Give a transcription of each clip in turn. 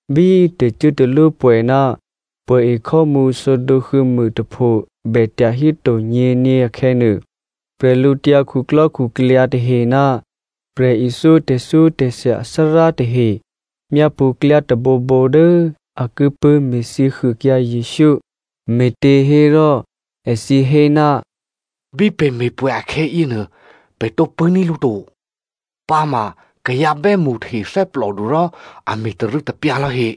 Bí tè̤cuốtalwópwè̌ ná pwè̌ekhò́mǔ sǒdǒ huô̌mûtapho bè tyahíto nyě̤nyě akhè̌nuô, bwídukhu tahe ná prè̤ithyó tè̤thyótè̤thya athárá tahe myápṳ̌ klyá tôbǒbǒ dố a ki pṳ̂́me̤thyě huôkyǎ Jesǔ. Me̤těhérò èthǐ hé, “Bí pè̤ me̤pwè̌ akhè̌yěnuô pè̤ tǒ pṳ̂́ní̤ lǔ to, pǎma kayǎ bè́mṳ tahe thè́plòdu rò a me̤tarû̌tapyǎ lò̌he.”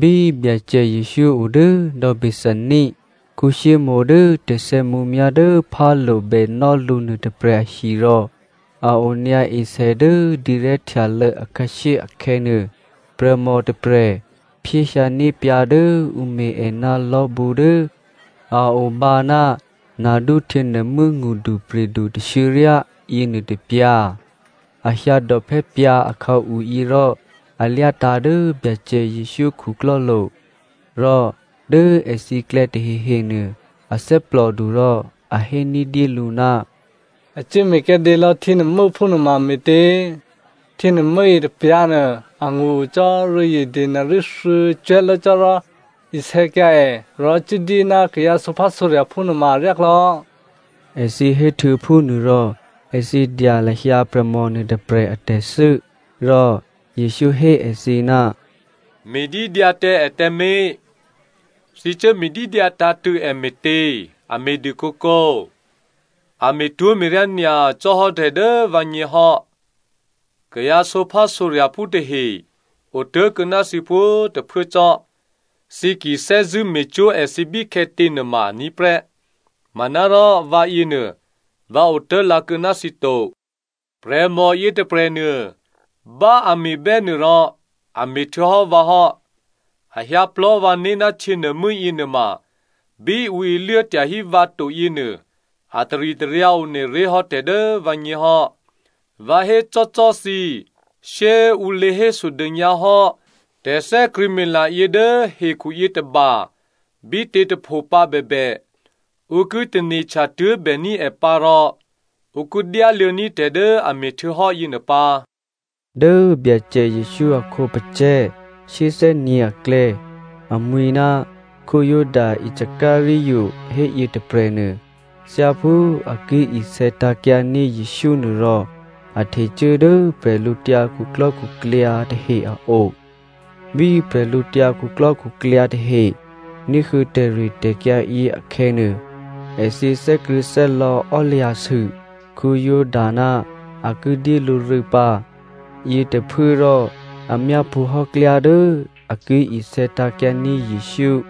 Bí Byacè Jesǔ o dố dò̌ Bethania Simonè dố tè̤sè̌mǔmyá̤ dố phálo̤ bènò́ lǔ nuôtôprè̤ ahi rò a onyǎ esè dố dǐrè̤́htyalô̌ akhǎshyé akhè̌nuô, prè̤mò tôprè̤ phyéhyǎní̤ pyǎ̤ dố ǔ me̤ è ná lò̤́bǔ dố a obǎ ná nardú htyěnuô̤mû́ ngṳdupri̤du tashuô̌ryá yěnuô tôpyǎ̤. A hyǎdòphè́ pyǎ̤ akhǎu yěrò a lyátǎ̤ dố Byacè Jesǔ khuklò́lo̤. Rò dố èthǐklè̌ tahehenuô a thè́plòdu rò a hé ní̤dyélǔ, “A cuố me̤kyǎdě lò̌ htyěnuô̤mû́ phúnuôma me̤tě? Htyěnuô̤mû́ yětôpyǎ̤nuô angṳ o cò́ rû̌zye denari thuô̌cwè̤́ lố cò́ rò, isè̌kyǎ è rò cuốdyé ná kayǎ sǒphásǒrya̤phú nuôma aryáklò̌,” èthǐ héhtuô̌ phúnuô rò èthǐ dya lahyǎ prè̤mò nuôtôprè̤ a tè̤thû́. Rò Jesǔ hé èthǐ, “Me̤dídyǎ tǎ è tǎmé̤. Thǐ cuố me̤dídyǎ tǎ̤tṳ̂̌ è me̤tě? A me̤dû kǒkǒ. A me̤twó̤me̤ryá nyacò́ hò́ tè̤ dố vǎgně hò́. Kayǎ sǒphásǒrya̤phú tahe otố̤kuô̌ ná thǐ pwǒ̤꤮ tôphuố cò́. Thǐ ki thè́zṳ̂́ me̤cwó̤ èthǐ bíkhè̌tě꤮ nuôma aní̤ prè́, manárò vǎyěnuô vǎ otố̤lǎ kuô̌ ná thǐ to. Prè̤mò yětôprè̤nuô bá꤮ a me̤bè́ nuô rò a me̤ htuô̌hò́ vǎ hò́. A hyǎ plò̤́ vǎné̤ ná htyěnuô̤mû́ yěnuôma bí ǔ iluố tyahí vǎ to yěnuô a taritaryǎ one ré̤ hò́ tè̤ dố vǎgně hò́. Vǎ hécò́꤮ cò́ thǐ, shyé꤮ ǔ lě hésodônyǎ hò́ tè̤thè́krṳ̂̌mila yě dố hekhu yětôba bítě꤮ tôpho pǎ bèbè, ǔ ki tane̤htya tuố̤bèní̤ è pǎ rò ǔ ki dyáluô̌ní̤ tè̤ dố a me̤htuô̌hò́ yěnuô pǎ.” Dố Byacè Jesǔ a khǒpacè̤̌ shyéthè́nyě̤ aklè̌ amwi̤ ná Juda Iscariot héyětôprè̤nuô, thyáphú a ki isè̌tǎ̤kyǎ ní̤ Jesǔ nuô rò a htecuố dố bwídukhu tahe a o. Bí bwídukhu tahe ní̤huô̌ tè̤ritè̤kyǎ yě akhè̌nuô, èthǐ thè́krṳ̂̌thè́lò̌ ò́lya̤sû Juda ná a ki dyé lǔ rû̌ pǎ. Yětôphuốrò a myápṳ̌hò́ klyá dố a ki isè̌tǎ̤kyǎní̤ Jesǔ.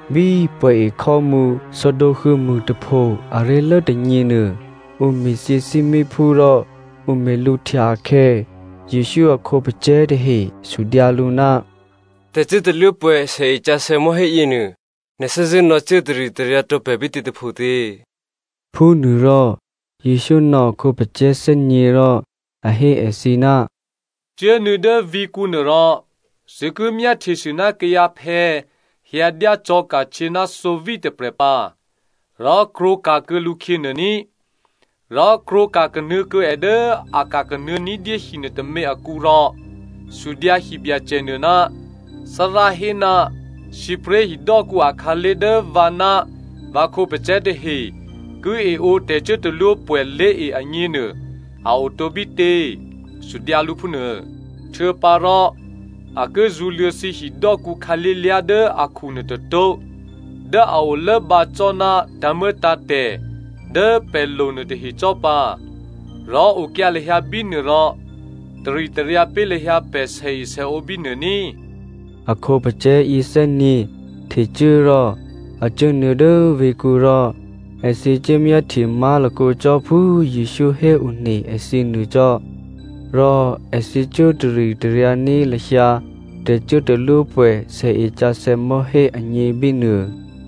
Bí pwè̌ e khò́mǔ sǒdǒ huô̌mûtapho aré̤lố tônyě nuô ǔ me̤thyě thímíphú rò ǔ me̤lǔhtya akhè̌, Jesǔ a khǒpacè̤̌ tahe sudyǎ lǔ, “Tè̤cuốtalwópwè̌ sèesǎsè̌ mò̤́hé yěnuô, nè̤ thè́zṳ̂́ nò̌cuố taritaryǎ tǒ pè̤ bítě tôphotě?” Phúnuôrò Jesǔ nò̌ a khǒpacè̤̌ thè́nyě̤ rò a hé èthǐ, “Cuốnuô̌ dố vǐ̤kǔnuô rò thǐ ki myáhtyesû ná kayǎphè̌ hyǎdyá cò̤̌ka̤htyě ná thǒví tôprè̤ pǎ. Rò krwǒka̤kuô̌ lǔkhyě nuô ní꤮. Rò krwǒka̤ kanuô̌ kuô̌ è dố a ka̤ kanuô̌ ní̤dyé hi nuôtômě akǔ rò sudyǎ hibyacènuô, ‘Thárá hé, sǐpré̤ hidò́kǔ akhǎlé̤ dố vǎ ná vǎ khǒpacè̤̌ tahe ki eǒ tè̤cuốtalwópwè̌ lé̤e agněnuô a otǒ bítě?’ Sudyǎ lǔ phúnuô. Htuô̌pǎrò a ki zṳ̌luô̌ thǐ hidò́kǔ khǎlé̤lyá̤ dố akhu nuôtôtó̤ dố a olốobǎ cò́ ná tǎ̤muô̌tǎ̤tè̤ dố pè̤ lo nuôtahe cò́ pǎ. Rò okyǎ lahyǎ bínuô rò taritaryǎ pé̤ lahyǎ pè̤ sèesèǒ bínuô ní꤮.” A khǒpacè̤̌ yěthè́nyě̤ htecuố rò a cuốnuô̌ dố vǐ̤kǔ rò èthǐ cuốmyáhtye má̤lakǒ cò́ phú Jesǔ héone èthǐ nuô cò́. Rò èthǐ cuố taritaryǎní̤ lahyǎ tè̤cuốtalwópwè̌ sèesǎsè̌ mò̤́hé agně bínuô.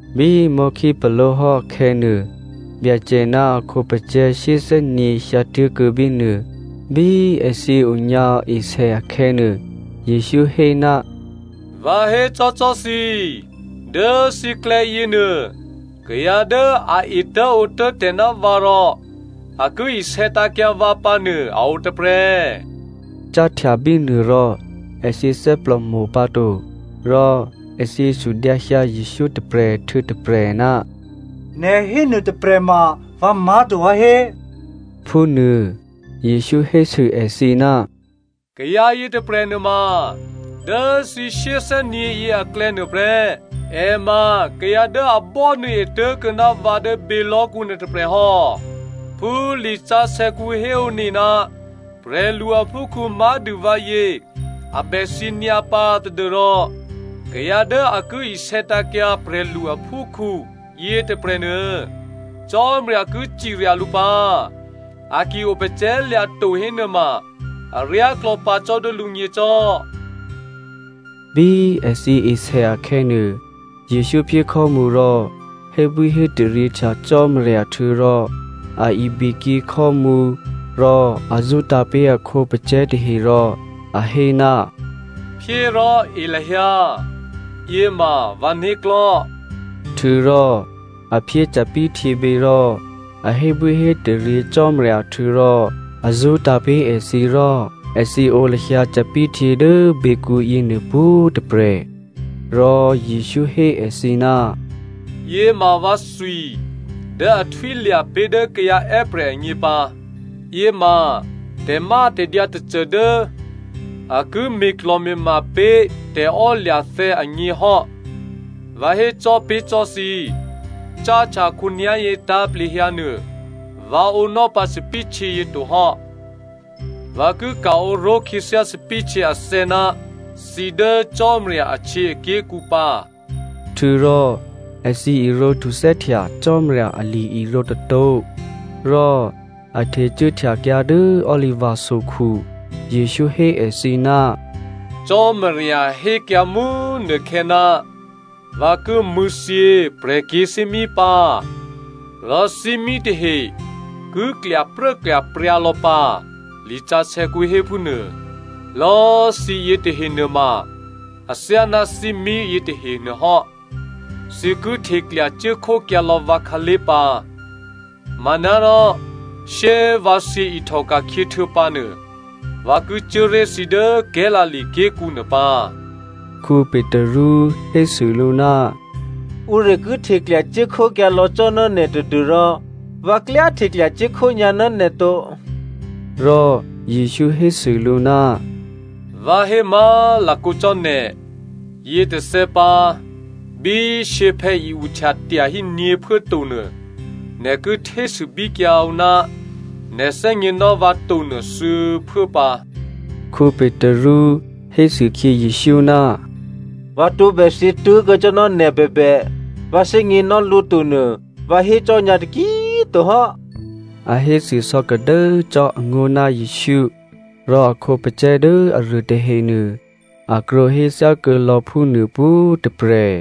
Bí mò̤́khípaló̤hò́ akhè̌nuô, Byacè ná a khǒpacè̤̌ shyéthè́nyě̤ hyǎtuố̤kuô̌ bínuô. Bí èthǐ onyǎ esè akhè̌nuô, Jesǔ hé, “Vǎ hécò́cò́ thǐ, dố thǐklè̌ yěnuô, kayǎ dố a etố̤ǒtố̤ tè̤ ná vǎ rò a ki isè̌tǎ̤kyǎ vǎ pǎnuô a o tôprè̤.” Cáhtya bínuô rò èthǐ thè́plòmo̤ pǎto, rò èthǐ sudyǎhyǎ Jesǔ tôprè̤ htuô̌ tôprè̤, “Nè̤ hénuô tôprè̤ma vǎ má̤to vǎhé?” phúnuô. Jesǔ hésû èthǐ, “Kayǎ yětôprè̤ nuôma dố thǐ shyéthè́nyě̤ yěaklè̌nuô prè́. È ma kayǎ dố a bò́nuô̌e tố̤kuô̌ ná vǎ dố bělò̤́kǔ nuôtôprè̤ hò́. Phú lisǎsè̌kǔ héone ná prè̤lu aphúkhǔ má̤dû vǎyě a bè thyě nyǎpǎ tadû́rò kayǎ dố a ki isè̌tǎ̤kyǎ prè̤lu aphúkhǔ yětôprè̤nuô, Cò́marya ki cirya lǔ pǎ. A ki opacè̤̌lya̤ to hénuôma aryáklò̌ pǎ cò́ dố lǔgně cò́.” Bí èthǐ esè akhè̌nuô, Jesǔ phyé khò́mǔ rò hébwíhétaryěhtya Cò́marya htuô̌rò a ibikyě khò́mǔ rò a zṳ́tǎ̤ pé̤ a khǒpacè̤̌ tahe rò a hé, “Phyé rò e lahyǎ, yěma vǎ né̤klò̤́.” Htuô̌rò a phyé thòbǐthèhtyěbě rò a hébwíhétaryě Cò́marya htuô̌rò a zṳ́tǎ̤ pé̤ èthǐ rò èthǐ ǒ lahyǎ thòbǐthèhtyě dố běkǔ yěnuô pwǒ̤꤮ tôprè̤. Rò Jesǔ hé èthǐ, “Yěma vǎthwi dố a ki htwílya̤ pé̤ dố kayǎ è́prè̤ agně pǎ. Yěma tè̤mátè̤dyǎ tôcô dố a ki me̤klò̤me̤ma pé̤ tè̤ò́lya̤thè̌ agně hò́. Vǎ hécò́ pé̤ cò́꤮ thǐ, cáhtya khǒnyá̤yě tǎ̤plehyǎnuô vǎ ǒnò́ pǎ thòbǐthèhtyě yě tohò́. Vǎ ki ka̤ǒ ró̤kuô̌ khyěthyá thòbǐthèhtyě athè̌ ná thǐ dố Cò́marya ahtyěaké̤kǔ pǎ.” Htuô̌rò èthǐ irǒ htuthè́htya Cò́marya ali-irǒ tôtó̤ rò a htecuốhtyakyǎ dố Oliva sokhu. Jesǔ hé èthǐ, “Cò́marya hékyǎ mú꤮ nukhè̌, ‘Vǎ ki mṳ̂̌thyě prè̤kyě̤thímí pǎ, rò thímí tahe ki klyapruốklyapryǎ lò̌ pǎ,’ lisǎsè̌kǔ hé phúnuô. “Lò̌꤮ thǐ yětahe nuôma athyáná thímí yětahe nuôhò́. Thǐ ki hteklya cuốkhókyǎlò̌ vǎ khǎlé̤ pǎ. Manárò shyé꤮ vǎ thyě ihtòka̤khyě htuô̌pǎnuô, vǎ ki cuố ré̤ thǐ dố Galilea ké̤kǔ nuô pǎ.” Petru hésû lǔ, “Ǔruô ki hteklya cuốkhókyǎlò̌ cò́ ná nè̤ tadû́rò vǎ klyá hteklya cuốkhó nyǎ ná nè̤ to.” Rò Jesǔ hésû lǔ, “Vǎ hé má̤lakǒ cò́ nè̤, yětôthè̌ pǎ bí shyěphè̌ i-uhtya tyahí nyě̤phuố to nuô, nè̤ ki htésûbíkyǎ ǔ ná nè̤ thè́gněnò́ vǎ tonuô, thuô̌phuố pǎ.” Petru hésûkhyě Jesǔ, “Vǎ tǒbè thyě tố̤kuô̌ cò́ ná nè̤ bèbè vǎ thè́gněnò́ lǔ to nuô vǎ hécò́ nyǎ taki꤮ to hò́,” a hésû sò̌kadố cò́ angó̤ ná Jesǔ, rò a khǒpacè̤̌ dố aruô tahenuô, a krwǒhé thyákuô̌lò̌ phúnuô pwǒ̤꤮ tôprè̤.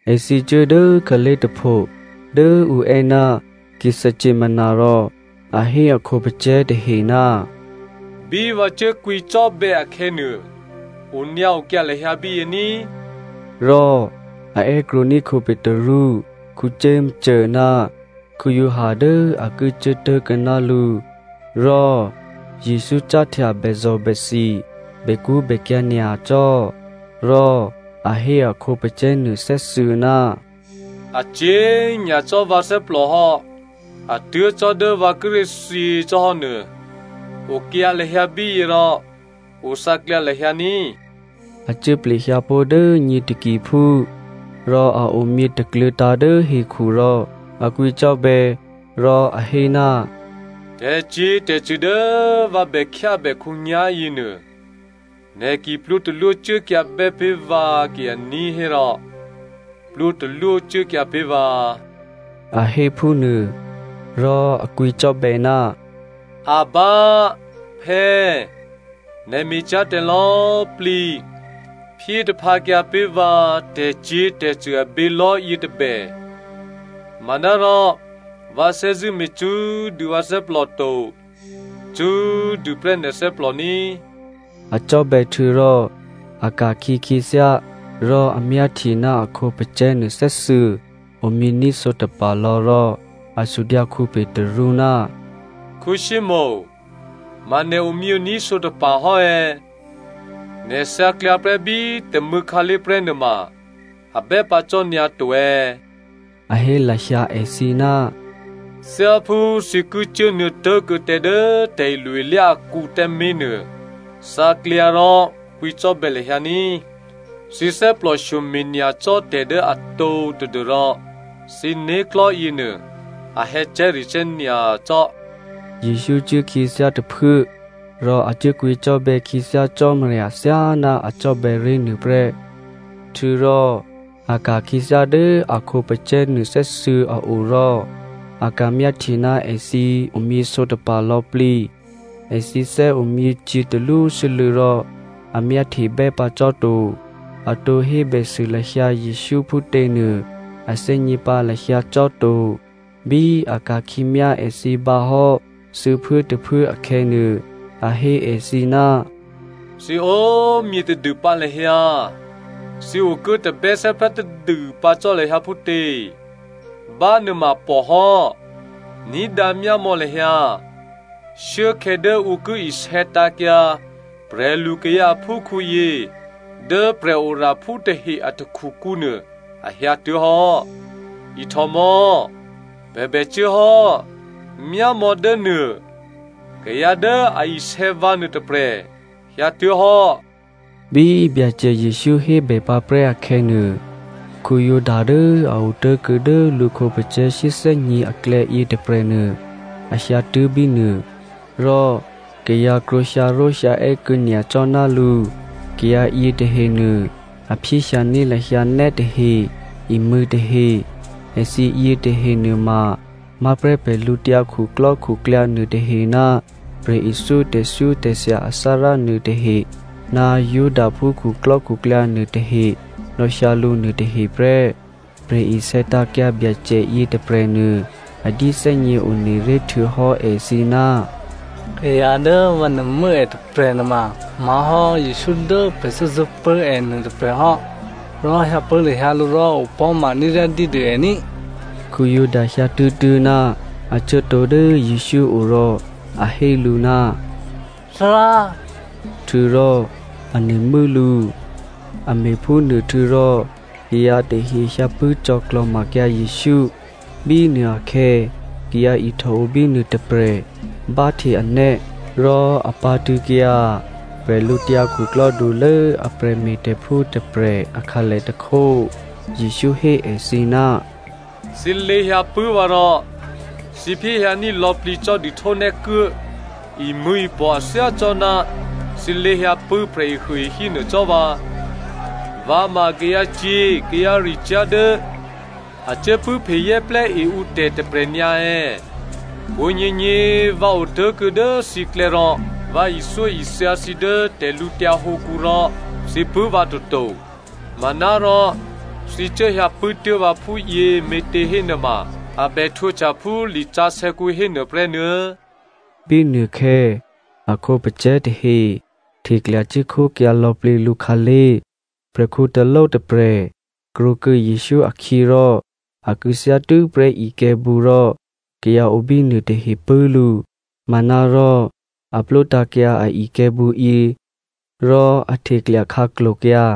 Èthǐ cuố dố khǎlé̤ tôpho dố ǔ è́ ná Gethsemani rò a hé a khǒpacè̤̌ tahe, “Bí vǎ cuốkwǐcò́bè̌ akhè̌nuô, onyǎokyǎ lahyǎ bíyě ní꤮.” Rò a è́krwǒní̤ Petru, Jakomo ná Giovanni dố a ki cuố tố̤kuô̌ ná lǔ. Rò Jesǔ cáhtya bèzò̤bèthi bèkṳ́bèkyǎ̤ nyacò́. Rò a hé a khǒpacè̤̌ nuô thè́thuô̌, “A cyě̤ nyacò́ vǎ thè́plò hò́ a tuố̤ cò́ dố vǎ kíré̤ thyě cò́hò́nuô, okyǎ lahyǎ bíyě rò othǎklyǎ lahyǎ ní꤮.” A cuố plehyǎpó̤ dố nyě takiphú rò a omyě takluô̤̌tǎ̤ dố hekhu rò a kwǐcò́bè̌ rò a hé, “Tè̤cyě̤tè̤cṳ̂ dố vǎ bè khyábè khǒnyá̤ yěnuô, nè̤ ki plwǒ talwó cuốkyǎbè́ pé̤ vǎ ki aní̤ hérò plwǒtalwó cuốkyǎ pé̤ vǎ,” a hé phúnuô. Rò a kwǐcò́bè̌, “Abba, Phè̌꤮, nè̤ me̤cyá̤ tè̤lò̌꤮ plǐ, phyé taphǎkyǎ pé̤ vǎ tè̤cyě̤tè̤cṳ̂ abělò̤́ yětôbè. Manárò vǎ thè́zṳ̂́ me̤ cṳ́꤮ dû vǎ thè́plò to. Cṳ́꤮ dûprè́ nè̤ thè́plò ní꤮.” A cò́bè̌ htuô̌rò a ka̤khyě khyěthyá rò a ka̤myáhtye ná a khǒpacè̤̌nuô thè́thuô̌ omyění̤ sǒtapa̤ lò̌ rò a sudyǎ Petru, “Simonè ma nè̤ omyění̤ sǒtapa̤ hò́ è̌, nè̤ thǎklyǎ prè́ bí tômû̌ khǎlé̤ prè́nuô ma a bè́ pǎ cò́nyǎ to è̌” a hé lahyǎ èthǐ, “Thyáphú thǐ ki cuốnuô̌ tố̤kuô̌ tǎ dố tè̤ilo-ilyá akǔ tǎmé̤nuô, thǎklyǎ rò kwǐcò́bè̌ lahyǎ ní꤮. Thǐ thè́plòshyome̤ nyacò́ tè̤ dố atǒ tadû́rò thǐ né̤klò̤́ yěnuô a hè̌cè̤́recè̤́ nyacò́.” Jesǔ cuốkhyěthyá tôphuố rò a cuốkwǐcò́bè̌ khyěthyá Cò́marya thyáná a cò́bè̌ ré̤ nuô prè́. Htuô̌rò a ka̤ khyěthyá dố a khǒpacè̤̌ nuôthè́thuô̌ a o rò a ka̤myáhtye ná èthǐ omyěsǒtapa̤ lò̌plǐ. Èthǐ thè́omyě cyě̤talwósû́lû̌ rò a myáhtebè́ pǎ cò́ to. A tǒ hébèsû lahyǎ Jesǔ phútěnuô a thè́gně pǎ lahyǎ cò́ to. Bí a ka̤khyě myá èthǐ bǎhò́ thuô̌phuốtôphuố akhè̌nuô, a hé èthǐ, “Thǐ o꤮ myě tadûpǎ lahyǎ, thǐ okuố tabè́thè́prá tadû pǎ cò́ lahyǎ phútě? Bánuôma pò hò́. Ní̤dǎ myámò̌ lahyǎ, shuốkhè̌ dố ǔ ki isè̌tǎ̤kyǎ prè̤lukayǎ aphúkhǔyě dố prè̤oraphú tahe a takhukǔnuô, a hyǎtuố̤hò́. Ihtò mò̌! Pè̤ bè cuốhò́! Myámò̌dốnuô, kayǎ dố a isè̌ vǎ nuôtôprè̤ hyǎtuố̤hò́!” Bí Byacè Jesǔ hébè pǎprè́ akhè̌nuô, Juda dố a otố̤kuô̌ dố lǔ khǒpacè̤̌ shyéthè́nyě̤ aklè̌ yětôprè̤nuô a hyǎtuố̤ bínuô. Rò kayǎ krwǒ hyǎró̤hyǎè́ kuô̌ nyacò́ ná lǔ. Kayǎ yětahenuô a phyéhyǎní̤ lahyǎ nè́tahe, imṳ̂̌tahe. Èthǐ yětahe nuôma má̤prè́ bwídukhu nuôtahe ná prè̤ithyó tè̤thyótè̤thya athárá nuôtahe ná Judaphú khuklò́khuklyǎ nuôtahe nò̌hyǎ lǔ nuôtahe prè́. Prè̤isè̌tǎ̤kyǎ Byacè yětôprè̤nuô a dyéthè́gně one ré̤ htuô̌hò́ èthǐ, “Kayǎ dố vǎ nuô̤mû́ è tôprè̤ nuôma má̤hò́ Jesǔ dố pè̤ thè́zṳ̂́pṳ̂́ è nuôtôprè̤ hò́ rò hyǎpṳ̂́ lahyǎ lǔ rò opò̤́ma ní̤ryádyédû è ní꤮.” Juda hyǎtuố̤tuố̤ ná a cuốtǒ dố Jesǔ o rò a hé lǔ, “Thárá꤮” htuô̌rò a nuô̤mû́ lǔ. A me̤phúnuô htuô̌rò kayǎ tahe hyǎpṳ̂́ cò̌klò̤makyǎ Jesǔ. Bínuô akhè̌ kayǎ ihtòo bínuô tôprè̤ báhte anè́ rò a pǎ̤tṳ̂̌kyǎ bwídukhulố a prè̤me̤tè̤phú tôprè̤ akhǎlè tôkhó. Jesǔ hé èthǐ, “Thǐ lě hyǎpṳ̂́ vǎ rò thǐ phyéhyǎní̤ lò̌plǐ cò́ dihtónè́kuố, imṳ̂̌ipò̤ a thyácò́ná thǐ lě hyǎpṳ̂́ prè̤ehuôehí nuô cò́ vǎ? Vǎ ma kayǎcyě̤ kayǎricyá̤ dố a cuốpṳ̂́phezè́plè́ e ǔtè̤ tôprè̤ nyǎ è̌? Pwǒ̤nyěnyě꤮ vǎ otố̤kuô̌ dố thǐklè̌ rò vǎ ithyóithya thǐ dố tè̤lǔtyǎ hǒkǔ rò thǐ pṳ̂́ vǎ toto. Manárò thǐ cuốhyǎpṳ̂́ tuố̤ vǎ phúyě me̤těhénuôma a bè htwǒhtya phú lisǎsè̌kǔ hénuô prè́nuô̌.” Bínuôkhè̌ a khǒpacè̤̌ tahe hteklya cuốkhókyǎ lò̌plǐ lǔkhǎlé̤. Prè̤khǔ taló tôprè̤ krwǒkuô̌ Jesǔ akhyě rò a kû̌thyá tû́prè́ ikè̤̌bǔ rò kayǎ o bínuô tahe pṳ̂́ lǔ. Manárò a plwótǎ̤kyǎ a ikè̤̌bǔyě rò a hteklya khǎklo̤kyǎ.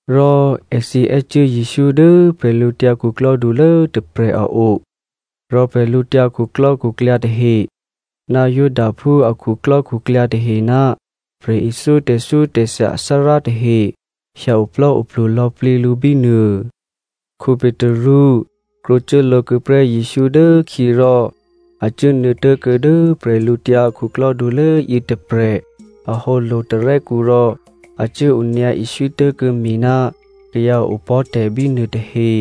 Rò èthǐ è́cuố Jesǔ dố bwídukhulố tôprè̤ a o rò bwídukhu tahe, ná Judaphú a khuklò́khuklyǎ tahe ná prè̤ithyó tè̤thyótè̤thya athárá tahe hyǎoplò́oplu lò̌plǐ lǔ bínuô. Petru krwǒcuố lǒ kuô̌ prè́ Jesǔ dố khyě rò a cuốnuô̌ tuố̤kuô̌ dố bwídukhulố yětôprè̤ ahǒ lo̤tarè́kǔ rò a cuố onyǎ iswí tố̤kuô̌ mi ná kayǎ opò̤́tè̤ bínuô tahe.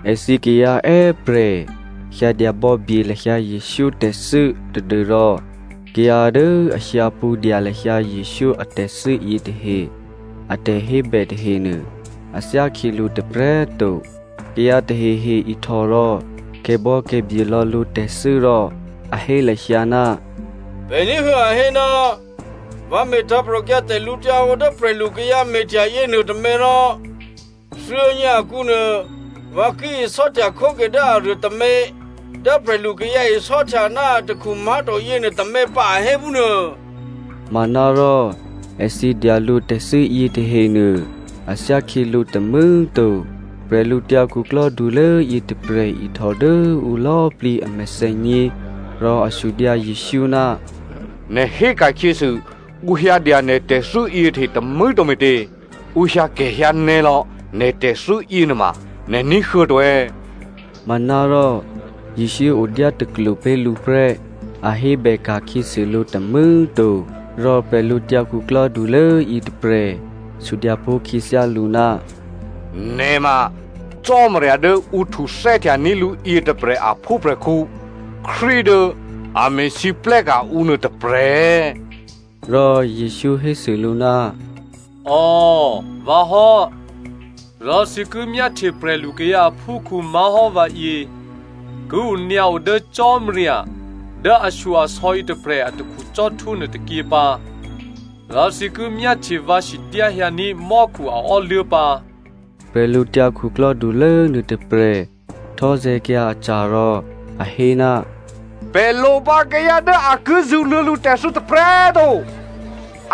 Èthǐ kayǎ è́prè̤ hyǎdya bò̌bye lahyǎ Jesǔ tè̤thû́ tadû́rò kayǎ dố a hyǎ pṳ̌dya lahyǎ Jesǔ atè̤thû́ yětahe a tè̤hébè tahenuô a thyákhyělǔ tôprè̤꤮ to. Kayǎ tahehe ihtò rò kè̤bò̌kè̤bye lò̌ lǔtè̤thû́ rò a hé lahyǎ, “Pè̤ ní̤huô̌ a hé, ‘Vǎ me̤ tǎ̤prò̤kyǎ tè̤lǔhǒdu dố prè̤lukayǎ me̤htya yěnuôtômě rò thuô̌nyě akǔnuô vǎ ki isò́htya khóke dố aruô tômě, dố prè̤lukayǎ isò́htya ná atakhu má̤to yěnuô tômě pǎ,’ a hé phúnuô.” Manárò èthǐ dya lǔtè̤thû́ yětahenuô a thyákhyělǔ tômû̌꤮ to. Bwídukhulố yětôprè̤ ihtò dố ǔ lò̌꤮ plǐ a mèthènyě rò a sudyǎ Jesǔ, “Nè̤ hé ka̤khyěsû ǔ hyǎdya nè̤ tè̤thû́ yětahe tômû̌꤮ to me̤tě? Ǔ hyǎkè̤hyǎnè̌lò̌ nè̤ tè̤thû́ yěnuôma nè̤ ní̤huô̌ to è̌?” Manárò Jesǔ odyátaklwo pé̤ lǔ prè́, a hébè ka̤khyěsû lǔ tômû̌꤮ to. Rò bwídukhulố yětôprè̤ sudyǎ pó̤ khyěthyá lǔ, “Nè̤ ma Cò́marya dố ǔ htuthè́htyaní̤ lǔ yětôprè̤ aphúprè̤khǔ Krístu dố a me̤lwóhteka̤ ǔ nuô tôprè̤ è̌?” Rò Jesǔ hésû lǔ, “Ò, vǎ hò́. Rò thǐ ki myáhtye prè̤lukayǎ aphúkhǔ má̤hò́ vǎyě ki onyǎo dố Cò́marya dố ashyo-asò̌ yětôprè̤ atakhu cò́htwó nuôtôkyě pǎ, rò thǐ ki myáhtye vǎ sidyáhyǎní̤ mò́khu a ò́luố̤ pǎ.” Bwídukhulố nuôtôprè̤ htò́zè̤̌kyǎ aca̤ rò a hé, “Pè̤ lopǎ kayǎ dố a ki zṳ̌luô̌ lǔtè̤thû́ tôprè̤꤮ to.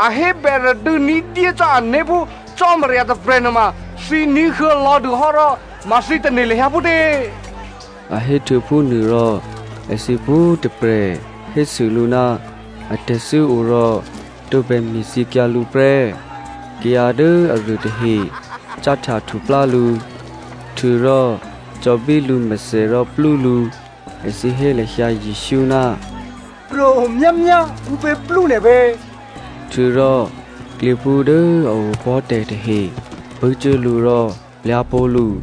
A hébè radû̌ ní̤dyé cò́ ané̤ phú Cò́marya tôprè̤ nuôma thǐ ní̤huô̌ lò̌dûhò́ rò ma thǐ tane̤ lahyǎ phútě?” A héhtuô̌ phúnuô rò èthǐ pwǒ̤tôprè̤ hésû lǔ ná atè̤thû́ o rò tǒbè me̤thyěkyǎ lǔ prè́. Kayǎ dố aruô tahe cáhtya htuplá lǔ, htuô̌rò cò̌bí lǔmèthè rò plú lǔ. Èthǐ hé lahyǎ Jesǔ, “Pro̤myámyá, ǔpě plú nè̤ pě?” Htuô̌rò klyěphú dố a opò̤́ tè̤ tahe pṳ̂́cuố lǔ rò plyá̤ pó̤ lǔ.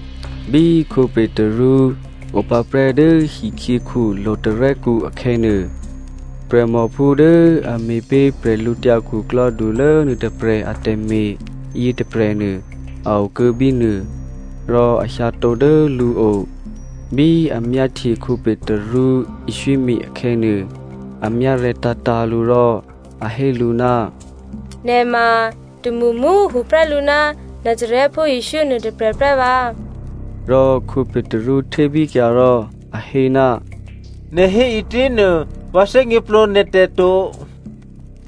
Bí Petru opǎprè́ dố hikhyěkhu lo̤tarè́kǔ akhè̌nuô, prè̤mòphú dố a me̤ pé̤ bwídukhulố nuôtôprè̤ atè̤me̤ yětôprè̤nuô a okuô̌ bínuô, rò a hyǎtǒ dố lǔo. Bí a myáhtye Petru iswími akhè̌nuô, a myárè̤̌tǎ̤tǎ̤ lǔ rò a hé lǔ, “Nè̤ ma tômṳmṳ꤮ tuô̌prè́ lǔ ná Nazarèphú Jesǔ nuôtôprè̤ prè́ vǎ.” Rò Petru htébíkyǎ rò a hé, “Nè̤ hé ǐtěnuô vǎ thè́gněplǒ nè̤tè̤ to,”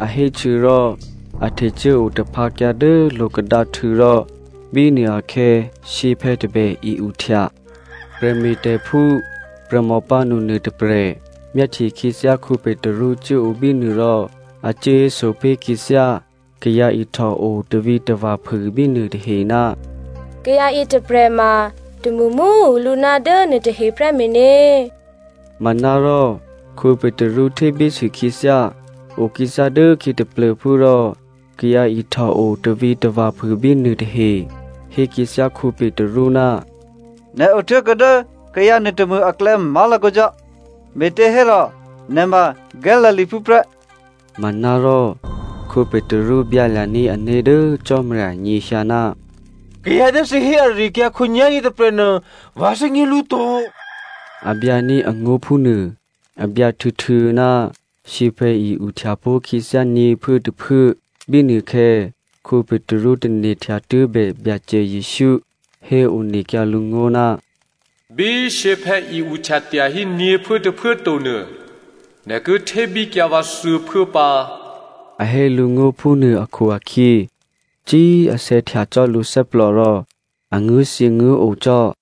a héhtuô̌rò a htecuố otaphǎkyǎ dố lo̤kadǎhtû̌ rò bínuôakhè̌ shyěphè̌ tôbè i-uhtya. Prè̤me̤tè̤phú prè̤mò pǎnu nuôtôprè̤ myáhtye khyěthyá Petru cuốo bínuô rò a cuốhéso pé̤ khyěthyá kayǎ ihtòo tavǐtava̤ phû bínuô tahe, “Kayǎ yětôprè̤ ma tômṳmṳ꤮ tuô̌ lǔ ná dố nuôtahe prè́ meně.” Manárò Petru htébísû khyěthyá. Okhyěthyá dốkhyě taplô̤phú rò kayǎ ihtòo tavǐtava̤ phû bínuô tahe hé khyěthyá Petru, “Nè̤ otố̤kuô̌ dố kayǎ nuôtômṳ aklè̌ má̤lakǒ cò́, me̤těhérò nè̤ ma Galileaphú prè́.” Manárò Petru byǎlya̤ní̤ ané̤ dố Cò́marya nyěhyǎ, “Kayǎ dố thǐ hé ari-akyǎ khǒnyá̤yě tôprè̤nuô vǎ thè́gně lǔ to,” a byǎní̤ angó̤ phúnuô. A byǎ htuô̌htuô̌ ná shyěphè̌ i-uhtya pó̤khyěthyá nyě̤phuốtôphuố. Bínuôkhè̌ Petru tane̤htya tuố̤bè Byacè Jesǔ héonekyǎ lǔ ngó̤, “Bí shyěphè̌ i-uhtya tyahí nyě̤phuốtôphuố tonuô, nè̤ ki htébíkyǎ vǎ thuô̌phuố pǎ” a hé lǔ ngó̤ phúnuô akhu-akhyě cí꤮ asè̌htya cò́ lǔthè́plò rò a nguố̤thyěnguố̤o cò́.